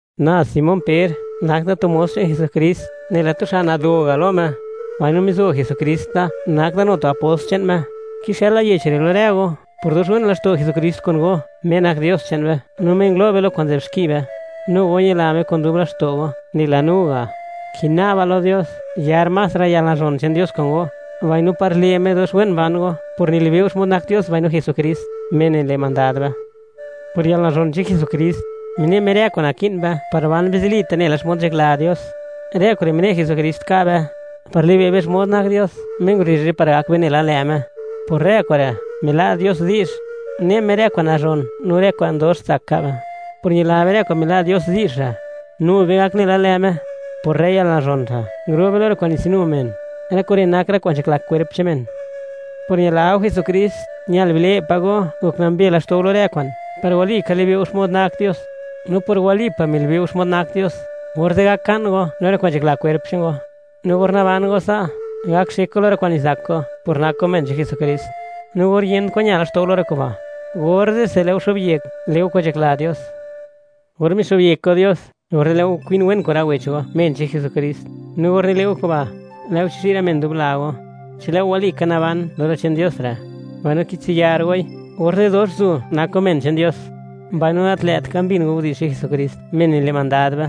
Na Simón Per, nak da tu mos che'n Jesukrist, nela tu xa' nado ga' lo Me; mbaino mizo Jesukrist da nak da nu tu apost che'n Me. Kixëla yech re' lo rë go; por dox wen laxto' Jesukrist kun go, Me nak Dios che'n be no Me ngulo' be lo kwa'n nzë'b xki be, nu go ñila Me kun dub laxto' go, nela no ga'. Kina'ba lo Dios, yar más rë yalnazhon che'n Dios kun go, mbaino par le' Me dox wen ban go por nilibe' go xmod nak Dios no Jesukrist, Me nile' mandad be. Por yalnazhon che'n Jesukrist, mine' Me rë kwa'n naki'n be par ban be zilita' nela xmod nzhakla Dios. Rë kure' mine' Jesukrist ka' be, par li'be' be xmod nak Dios, Me ngurezh be par gak be nela lë' Me. Por rë kure', mila' Dios di'zh, ne' Me rë kwa'n nazhon no rë kwa'n dox tsak ka' be. Por ñila be rë kwa'n mila' Dios di'zh re', nu be gak nela lë' Me; por rë yalnazhon re', nguro' be lo rë kwa'n nitsinu men; rë kure' nak rë kwa'n nzhakla kwerp che'n men. Por ñila go Jesukrist, ñal bile' pa' go, gok nambe laxto' go lo rë kwa'n, par walika libe' go xmod nak Dios. No por walipa' milibe' go xmod nak Dios, orze' gak ka'n go lo rë kwa'n nzhakla kwerp che'n go; no or naban go sa', gak xek go lo rë kwa'n nizak go por nak go men che'n Jesukrist; no or yent kwan ña laxto' go lo rë kuba', orze'se lë' go xo'byek le' go kwa'n nzhakla Dios. Or mixo'byek go Dios, orze' lë' go kwin wen kun rë wech go, men che'n Jesukrist; no or nile' go kuba', lë' go chizhi' rë men dub la go. Chi lë' go walika naban lo rë che'n Dios re', mbaino kitsiyar goi, orze' dox zu' nak go men che'n Dios, mbaino gat lë't ka mbin go widi'zh che'n Jesukrist, Me nile' mandad be.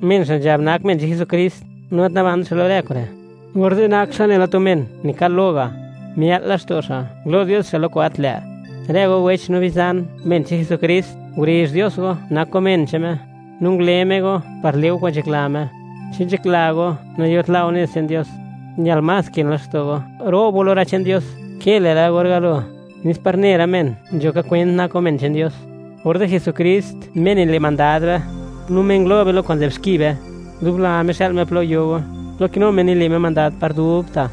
Men xa' nzhab nak men che'n Jesukrist, no gat nabant xa' lo rë kure', orze' nak xa' nela tu men nikal lo ga'; mia'l laxto' xa', ngulo' Dios xa' lo kwa'n gat lë'. Rë go wech no bizan, men che'n Jesukrist, ngurezh Dios go, nak go men che'n Me, no ngule Me go par le' go kwa'n nzhakla Me. Chi nzhakla go, nayot la' go nez che'n Dios, ñal más kën laxto' go, ro'b lo rë che'n Dios ke lë'la or galo, nes par ne rë men, nzho ka kwent nak go men che'n Dios. Orze' Jesukrist, Me nile' mandad be, no Me ngulo' be lo kwa'n nzë'b xki be, dub la Me xa'l Me plo yo go, plo kinu Me nile' Me mandad par dubta'.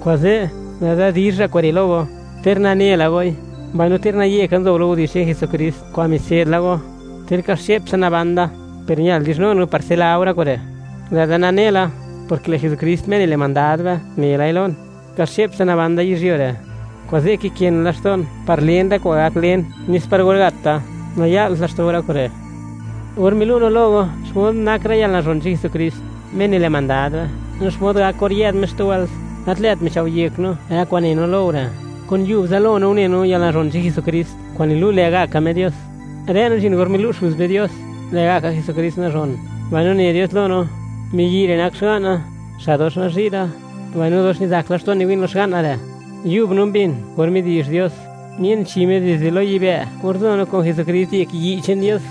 Kuze', lë'da dizh ra' kure' lo go; ter nane la goi, mbaino ter naye ka nzo go lo widi'zh che'n Jesukrist kwa'n mitse'd la go. Ter ka xche'ptsa naban da, per ñal dizhnun go par tsila go rë kure'. Lë'da nane la, porke lë' Jesukrist Me nile' mandad be ne lai lon, ka xche'ptsa naban da yizhyuo re'. Kuze', kikën laxto'n par len rë kwa'n gak len; nez par or gat da, naya'lt laxto' go rë kure'. Or milu' no lo go, xmod nak rë yalnazhon che'n Jesukrist Me nile' mandad be, no xmod gak or yë'd Me xtu wëlt, gat lë't michao' yek no rë kwa'n ne no lo go re'; kun yub zalo no une no yalnazhon che'n Jesukrist kwa'n nilu', lë'gaka Me Dios; rë no nzhin or milu' Xuz be Dios, lë'gaka Jesukrist nazhon, mbaino ne Dios lo no: “Miyi' re' nak Xga'na, Xa' dox nazhi' da, mbaino dox nizak laxto'n niwi'n lo Xga'na re'.” Yub no mbin, or midi'zh Dios; mien chi Me dizde lo yibë' or nzo no kun Jesukrist yek yi' che'n Dios.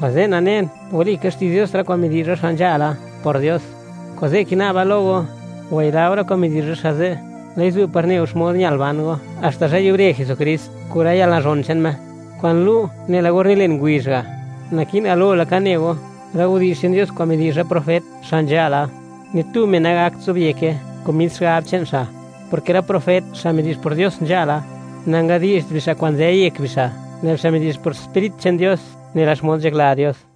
Kuze' nanen, walika xti'zh Dios, rë kwa'n midi'zh rë xa' nzhala por Dios; kuze' kina'ba lo go, wayila go rë kwa'n midi'zh rë xa' ze'; lë'i zu' par ne go xmod ñal ban go, haxta zhë yubre Jesukrist kun rë yalnazhon che'n Me, kwa'n lu' nela or nilen ngubizh ga'. Naki'n galo laka ne go: rë widi'zh che'n Dios kwa'n midi'zh rë profet xa' nzhala, ni tu men nagakt zobyeke kun mis xigab che'n xa', porke rë profet, xa' midi'zh por Dios nzhala, nangadi'zht bixa' kwa'n nzë yek bixa', lë' bixa' midi'zh por Sprit che'n Dios, nela xmod nzhakla Dios.